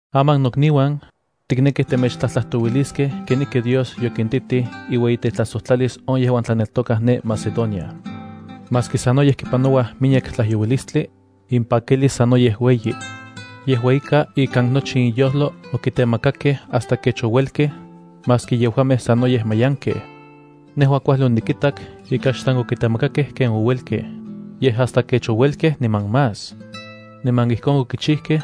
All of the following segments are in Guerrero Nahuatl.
Aman nokniuan, tiknekij temechtlajtlajtouiliskej kenijki Dios yokintitij iueyitetlajsojtlalis on yejuan tlaneltokaj ne Macedonia. Maski sanoyej kipanouaj miyek tlajyouilistli, impakilis sanoyej ueyi. Yejua ika, ikan nochi inyojlo okitemakakej hasta kech ouelkej, maski yejuamej sanoyej mayankej. Nejua kuajli onikitak ika xsan okitemakakej ken ouelkej, yej hasta kech ouelkej niman más. Niman ijkon okichijkej,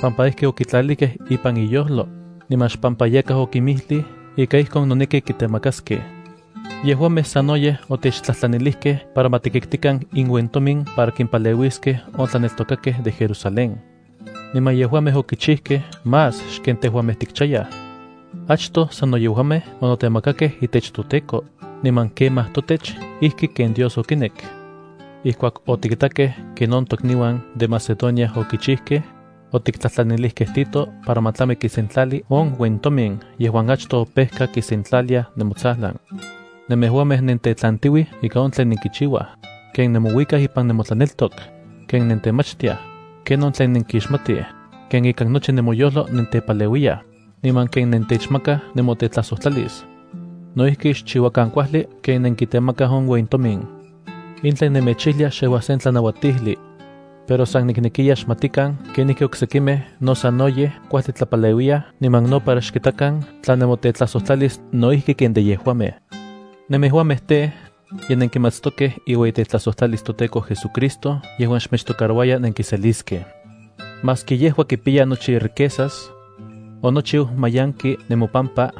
pampa ijki okitlalijkej ipan inyojlo, niman xpampa yakaj okinmijlij ika ijkon noneki kitemakaskej. Yejuamej sanoyej otechtlajtlanilijkej para ma tikitkikan inuentomin para kimpaleuiskej on tlaneltokakej de Jerusalén. Niman yejuamej okichijkej más xken tejuamej tikchayaj. Achtoj sano yejuamej onotemakakej itech toTEKO, niman kemaj totech, ijki ken Dios okinek. Ijkuak otikitakej ken on tokniuan de Macedonia okichijkej, otiktlajtlanilijkej Tito para ma tlami kisentlali on uentomin yejuan achtoj opejka kisentlalia nemotsajlan. Nemejuamej nentetlantiuij ika on tlen nenkichiuaj: ken nemouikaj ipan nemotlaneltok, ken nentemachtiaj, ken on tlen nenkixmatij, ken ikan nochi nemoyojlo nentepaleuiyaj, niman ken nentechmakaj nemotetlajsojtlalis. No ijki xchiuakan kuajli ken nenkitemakaj on uentomin. In tlen nemechijlia xejua sen tlanauatijli. Pero san niknekya xmatikan kenijki oksekimej no sanoyej kuajli tlapaleuiyaj niman no para xkitakan tla nemotetlajsojtlalis no ijki ken de yejuamej. Nemejuamej tej, ye nenkimatstokej iueyitetlajsojtlalis toTEKO JesuCristo yejuan xmechtocarouaya nenkiseliskej. Maski yejua kipiya nochi riquezas, onochiu manyanki nemopampa,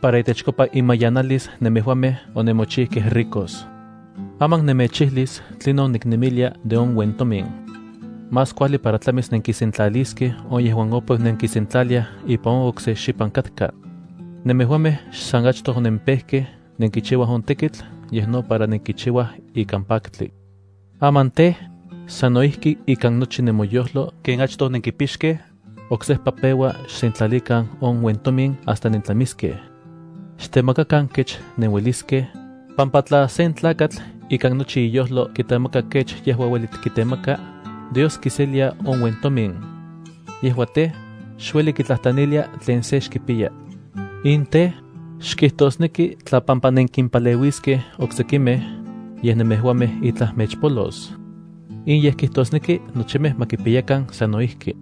para itechkopa imanyanalis nemejuamej onemochikej ricos. Aman nemechijlis tlinon niknemilia de on uentomin. Más kuajli para tlamis nenkisentlaliskej on uentomin yejuan opeu nenkinsentlaliaj ipan on okse xipan katka. Nemejuamej xsan achtoj onenpejkej nenkichiuaj on tekitl, yej no para nenkichiuaj ikan paktli. Aman tej, sano ijki ikan nochi nemoyojlo ken achtoj onenkipixkej, oksejpa peua xsentlalikan on uentomin hasta nentlamiskej. Xtemakakan kech nenueliskej, pampa tla sen tlakatl ikan nochi iyojlo kitemaka kech yejua ueli kitemaka, Dios kiselilia on uentomin. Yejua tej, xueli kitlajtlanilia tlen sen xkipiya. In tej, xkijtosneki tla pampa nenkimpaleuiskej oksekimej, yej nemejuamej itlaj mechpolos. In yej kijtosneki nochimej ma kipiyakan sanno ijki.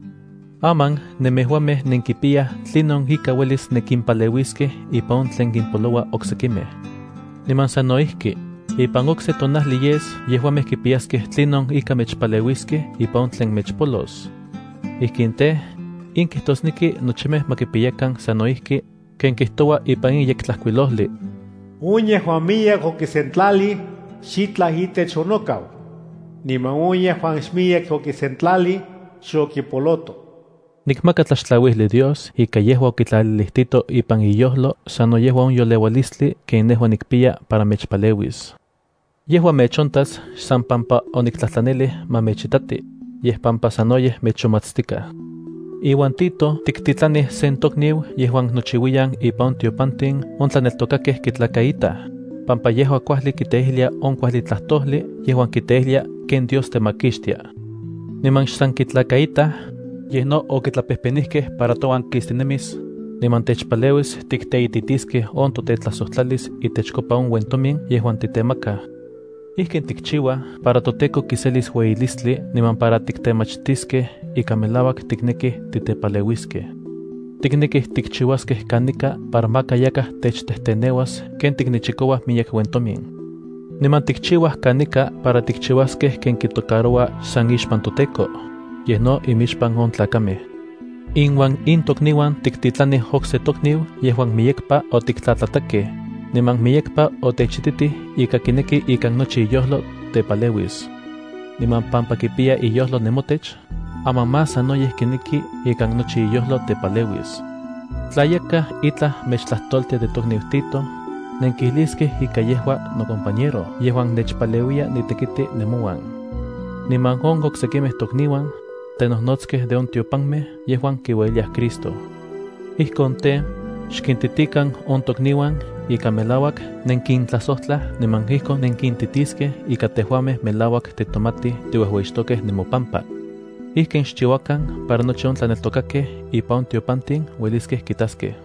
Aman nemejuamej nenkipiyaj tlinon ika uelis nenkimpaleuiskej ipan on tlen kimpoloua oksekimej. Niman sano ijki, ipan okse tonajli yes yejuamej kipiyaskej tlinon ika mechpaleuiskej ipan on tlen mechpolos. Ijkin tej, in kijtosneki nochimej ma kipiyakan sanno ijki, ken kijtoua ipan in Yektlajkuilojli: “On yejuan miyek okisentlalij, xitlaj itech onokau; niman on yejuan xmiyek okisentlalij, xokipoloto.” Nikmaka tlaxtlauijli Dios ika yejua okitlalilij Tito ipan iyojlo sano yejua on yoleualistli ken nejua nikpiya para mechpaleuis. Yejua mechontas xsan pampa oniktlajtlanijlij ma mechitati, yej pampa sanoyej mechonmatstikaj. Iuan Tito tiktitlanij sen tokniu yejuan nochiuiyan ipan on tiopantin on tlaneltokakej kitlakaitaj, pampa yejua kuajli kiteijlia on kuajli tlajtojli yejuan kiteijlia ken Dios temakixtia. Niman xsan kitlakaitaj, yej no okitlapejpenijkej para touan kistinemis, niman techpaleuis tikteititiskej on totetlajsojtlalis itechkopa on uentomin yejuan tiktemakaj. Ijkin tikchiuaj para toTEKO kiselis ueyilistli niman para tiktemachistiskej ika melauak tiknekij titepaleuiskej. Tiknekij tikchiuaskej kanika para maka yakaj techtejteneuas ken tiknechikouaj miyek uentomin. Niman tikchiuaj kanika para tikchiuaskej ken kitocaroua xsan ixpan toTEKO, yej no imixpan on tlakamej. Inuan in tokniuan tiktitlanij okse tokniu yejuan miyekpa otiktlatlatakej, niman miyekpa otechititij ika kineki ikan nochi iyojlo tepaleuis. Niman pampa kipiya iyojlo nemotech, aman más sanoyej kineki ikan nochi iyojlo tepaleuis. Tla yakaj itlaj mechtlajtoltia de tokniu Tito, nenkijliskej ika yejua nocompañero yejuan nechpaleuiya nitekiti nemouan. Niman on oksekimej tokniuan, tenojnotskej de on tiopanmej yejuan kiueyiliaj Cristo. Ijkon tej, xkintitikan on tokniuan ika melauak nenkintlajsojtlaj niman ijkon nenkintitiskej tline ika tejuamej melauak titomatij tiuejueyixtokej nemopampa. Ijkin xchiuakan para nochi on tlaneltokakej ipan on tiopantin ueliskej kitaskej.